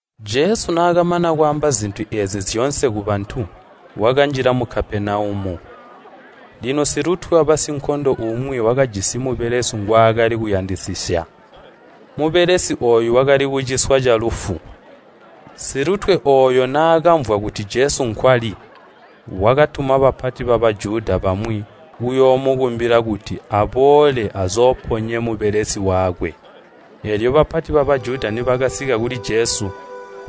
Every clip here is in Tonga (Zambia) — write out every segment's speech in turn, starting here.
Jesu naakamana kwaamba zintu eezi zyoonse kubantu, wakanjila mu Kapenaumu. Lino silutwe wabasinkondo umwi wakajisi mubelesi ngwaakali kuyandisisya. Mubelesi ooyo wakali kuciswa calufu. Silutwe ooyo naakamvwa kuti Jesu nkwali, wakatuma bapati ba Bajuda bamwi kuyoomukumbila kuti aboole azooponye mubelesi wakwe. Eelyo bapati ba Bajuda nibakasika kuli Jesu,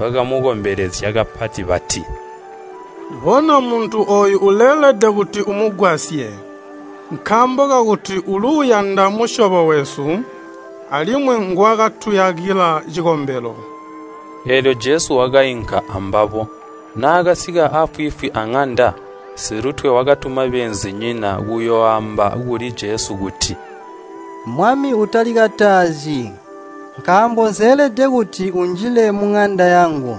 bakamukombelezya kapati, bati, “Bona muntu ooyu uleelede kuti umugwasye, nkaambo kakuti uluuyanda musyobo wesu, alimwi nguwakatuyakila cikombelo.” Eelyo Jesu wakainka ambabo. Naakasika afwiifwi aŋanda, silutwe wakatuma beenzinyina kuyooamba kuli Jesu kuti, “Mwami, utalikatazyi, nkaambo nseelede kuti unjile muŋanda yangu.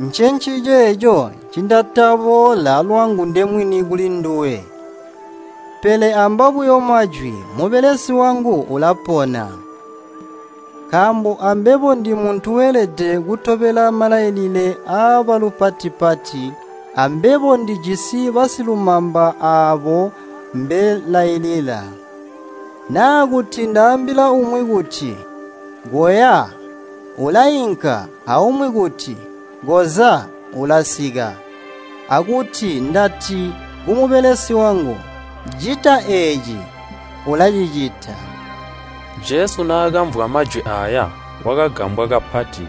Ncenciceeco ncindataboolela lwangu ndemwini kulinduwe. Pele amba buyo majwi, mubelesi wangu ulapona. Nkaambo ambebo ndimuntu weelede kutobela malailile aabalupati-pati, ambebo ndijisi basilumamba aabo mbelailila. Naa kuti ndaambila umwi kuti, ‘Koya!’ ulainka, aumwi kuti, ‘Koza!’ ulasika, akuti ndati kumubelesi wangu, ‘Cita eeci,’ ulacicita.” Jesu naakamvwa majwi aaya, wakagambwa kapati.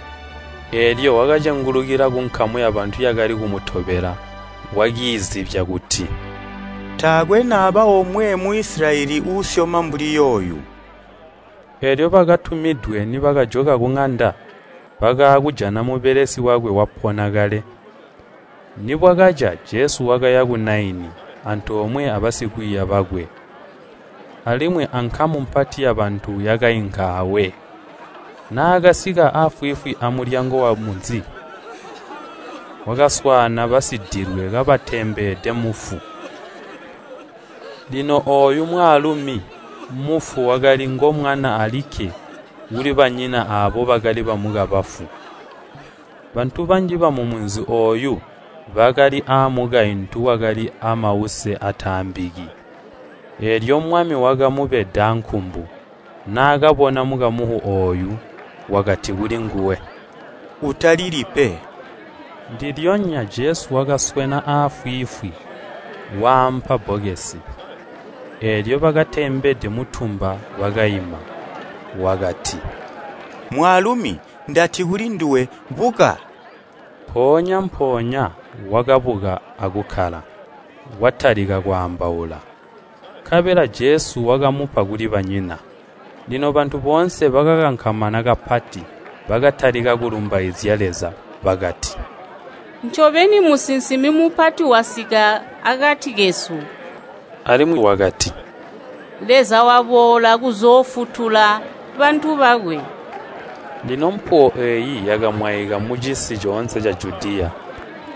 Eelyo wakacengulukila kunkamu yabantu yakali kumutobela wakiizibya kuti, “Taakwe naba omwe mu Isilayeli uusyoma mbuli yooyu!” Eelyo bakatumidwe, nibakajoka kuŋanda, bakaakujana mubelesi wakwe wapona kale. Nibwakaca, Jesu wakaya ku Naini, antoomwe abasikwiiya bakwe. Alimwi ankamu mpati yabantu yakainka awe. Naakasika afwiifwi amulyango wamunzi, wakaswaana basidilwe kabatembede mufu. Lino ooyu mwaalumi, mufu wakali ngomwana alikke kulibanyina aabo bakali bamukamufu. Bantu banji bamumunzi ooyu bakali aamukaintu wakali aamause aataambiki. Eelyo Mwami wakamubedaa nkumbu, naakabona mukamufu ooyu, wakati kulinguwe, “Utalili pe.” Ndilyonya Jesu wakaswena afwiifwi, waampa bbokesi, eelyo bakatembede muntumba bakaima. Wakati, “Mwaalumi, ndati kulinduwe, buka!” Mpoonya-mpoonya wakabuka akukkala, watalika kwaambaula. Nkabela Jesu wakamupa kulibanyina. Lino bantu boonse bakakankamana kapati. Bakatalika kulumbaizya Leza bakati, “Ncobeni musinsimi mupati wasika akati kesu!” alimwi bakati, “Leza waboola kuzoofutula bantu bakwe!” Lino mpuwo eeyi yakamwaika mucisi coonse ca Judiya,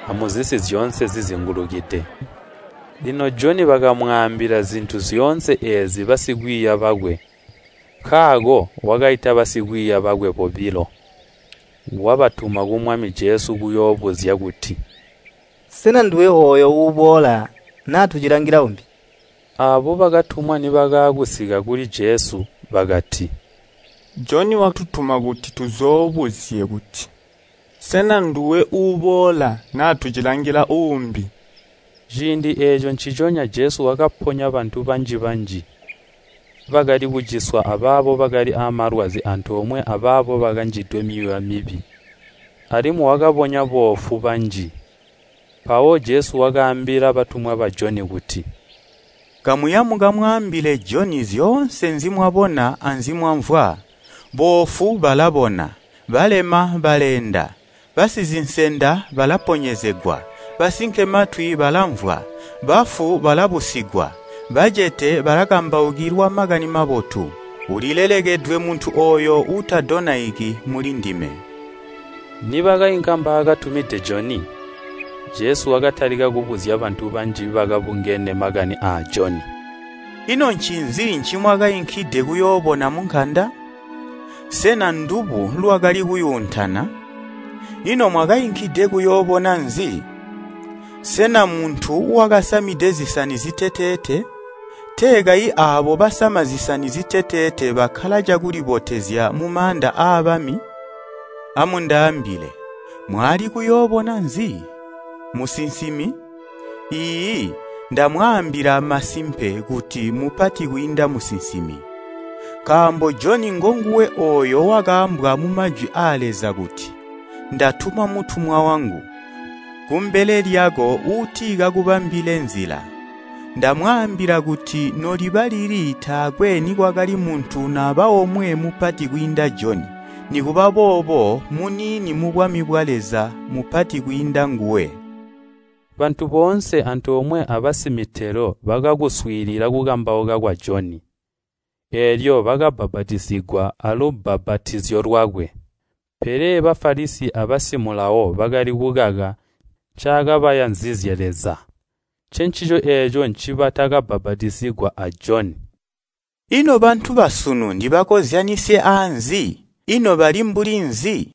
amuzisi zyoonse zizingulukide. Lino Joni bakamwaambila zintu zyoonse eezi basikwiiya bakwe. Nkaako wakaita basikwiiya bakwe bobilo, wabatuma ku Mwami Jesu kuyoobuzya kuti, “Sena nduwe ooyo ulaboola, naa tucilangila umbi?” Aabo bakatumwa nibakaakusika kuli Jesu bakati, “Joni watutuma kuti tuzoobuzye kuti, ‘Sena nduwe uuboola, na tucilangila uubi?’” Ciindi eeco nciconya Jesu wakaponya bantu banji-banji, bakali kuciswa abaabo bakali aamalwazi antoomwe abaabo bakanjidwe myuuya mibi, alimwi wakabonya boofu banji. Mpawo Jesu wakaambila batumwa ba Joni kuti, “Kamuya mukamwaambile Joni zyoonse nzimwabona anzimwamvwa, boofu balabona, balema baleenda, basizinsenda balaponyezegwa, basinkematwi balamvwa, bafu balabusigwa, bacete balakambaukilwa Makani Mabotu. Ulilelekedwe muntu ooyo uutadonaiki mulindime.” Nibakainka mbaakatumide Joni, Jesu wakatalika kubuzya bantu banji bakabungene makani aa Joni, “Ino ncinzi ncimwakainkide kuyoobona munkanda? Sena ndubu lwakali kuyuuntana? Ino mwakainkide kuyoobona nzi? Sena muntu wakasamide zisani ziteteete? Tee kayi aabo basama zisani ziteteete bakkala cakulibotezya mumaanda aabami. Amundaambile, Mwaali kuyoobona nzi? Musinsimi? Iiyi, ndamwaambila masimpe kuti mupati kwiinda musinsimi. Nkaambo Joni ngonguwe ooyo wakaambwa mumajwi aa Leza kuti, ‘Ndatuma mutumwa wangu, kumbele lyako uuti kakubambile nzila.’ Ndamwaambila kuti noliba lili taakwe nikwakali muntu naba omwe mupati kwiinda Joni, nikuba boobo muniini mubwami bwa Leza mupati kwiinda nguwe.” Bantu boonse antoomwe abasimitelo bakakuswiilila kukambauka kwa Joni, eelyo bakabbapatizigwa alubbapatizo lwakwe. Pele Bafalisi abamaiyi ba Mulawo bakali kukaka ncaakabayanzizye Leza. Ncencico eeco ncibatakabbapatizigwa a Joni. “Ino bantu basunu ndibakozyanisye aanzi? Ino bali mbuli nzi?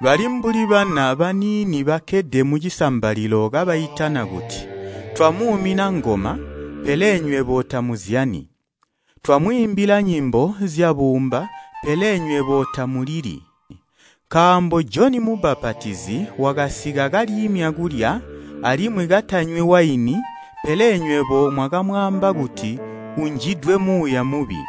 Bali mbuli bana baniini bakkede mucisambalilo kabaitana kuti, ‘Twamuumina ngoma, pele nywebo tamuzyani! Twamwiimbila nyimbo zyabuumba, pele nywebo tamulili!’ Nkaambo Joni Mubbapatizi wakasika kaliimya kulya, alimwi katanywi waini, pele nywebo mwakamwaamba kuti, ‘Unjidwe muuya mubi!’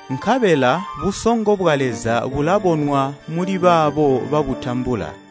Nkabela busongo bwa Leza bulabonwa muli baabo babutambula!”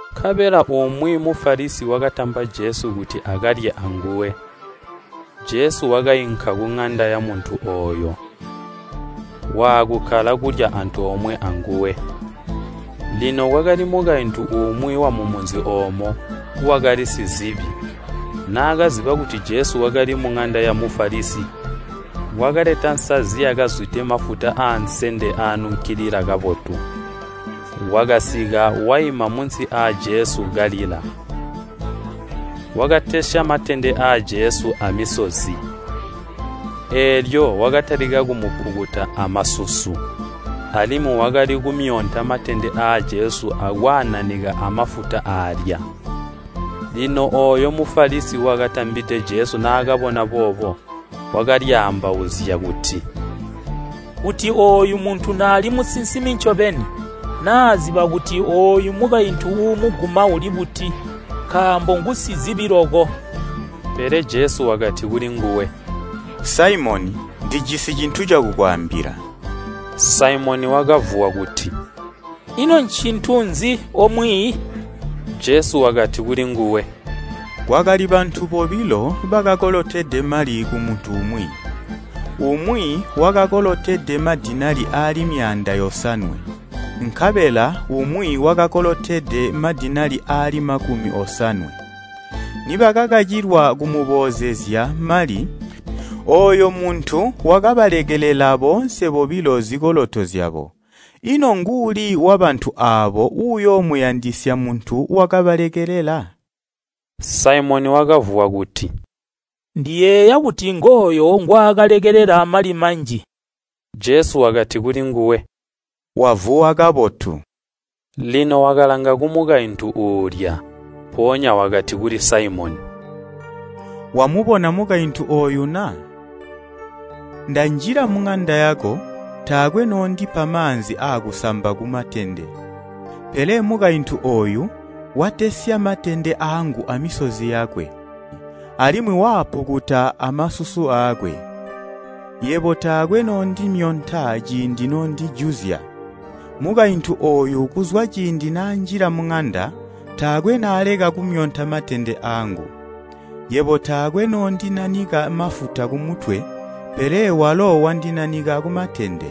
Nkabela umwi Mufalisi wakatamba Jesu kuti akalye anguwe. Jesu wakainka kuŋanda yamuntu ooyo, waakukkala kulya antoomwe anguwe. Lino kwakali mukaintu umwi wamumunzi oomo, wakali simamambe, naakaziba kuti Jesu wakali muŋanda ya Mufalisi, wakaleta nsazi yakazwide mafuta aansende aanunkilila kabotu. Wakasika, waima munsi aa Jesu kalila, wakatesya matende aa Jesu amisozi. Eelyo wakatalika kumupukuta amasusu, alimwi wakali kumyonta matende aa Jesu akwaananika amafuta aalya. Lino ooyo Mufalisi wakatambide Jesu naakabona boobo, wakalyaambauzya kuti, “Kuti ooyu muntu naali musinsimi ncobeni, naaziba kuti ooyu mukaintu uumuguma uli buti, nkaambo ngusimamambe.” Pele Jesu wakati kulinguwe, “Saimoni, ndijisi cintu cakukwaambila.” Saimoni wakavuwa kuti, “Ino ncintu nzi, O Mwiiyi?” Jesu wakati kulinguwe, “Kwakali bantu bobilo bakakolotede mali kumuntu umwi. Umwi wakakolotede mali ansiliva aali myaanda yosanwe, nkabela umwi wakakolotede mali aansiliva aali makumi osanwe. Nibakakacilwa kumuboozezya mali, ooyo muntu wakabalekelela boonse bobilo zikoloto zyabo. Ino nguuli wabantu aabo uyoomuyandisya muntu wakabalekelela?” Saimoni wakavuwa kuti, “Ndiyeeya kuti ngooyo ngwaakalekelela mali manji.” Jesu wakati kulinguwe, “Wavuwa kabotu.” Lino wakalanga kumukaintu uulya, mpoonya wakati kuli Saimoni, “Wamubona mukaintu ooyu na? Ndanjila muŋanda yako, taakwe noondipa maanzi aakusamba ku matende. Pele mukaintu ooyu watesya matende aangu amisozi yakwe, alimwi waapukuta amasusu aakwe. Yebo taakwe noondimyonta ciindi noondijuzya. Mukaintu ooyu kuzwa ciindi naanjila muŋanda, taakwe naaleka kumyonta matende aangu. Yebo taakwe noondinanika mafuta kumutwe, pele walo wandinanika kumatende.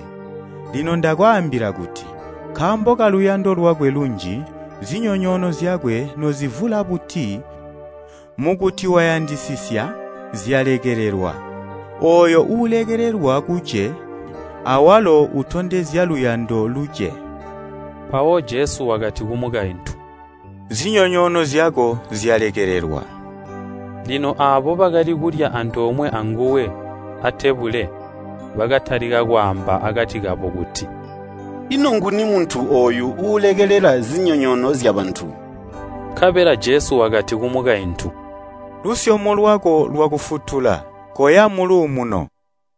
Lino ndakwaambila kuti, nkaambo kaluyando lwakwe lunji, zinyonyoono zyakwe nozivula buti, mukuti wayandisisya, zyalekelelwa. Ooyo uulekelelwa kuce awalo utondezya luyando luce.” Mpawo Jesu wakati kumukaintu, “Zinyonyoono zyako zyalekelelwa.” Lino aabo bakali kulya antoomwe anguwe atebule bakatalika kwaamba akati kabo kuti, “Ino nguni muntu ooyu uulekelela zinyonyoono zyabantu?” Nkabela Jesu wakati kumukaintu, “Lusyomo lwako lwakufutula. Koya muluumuno.”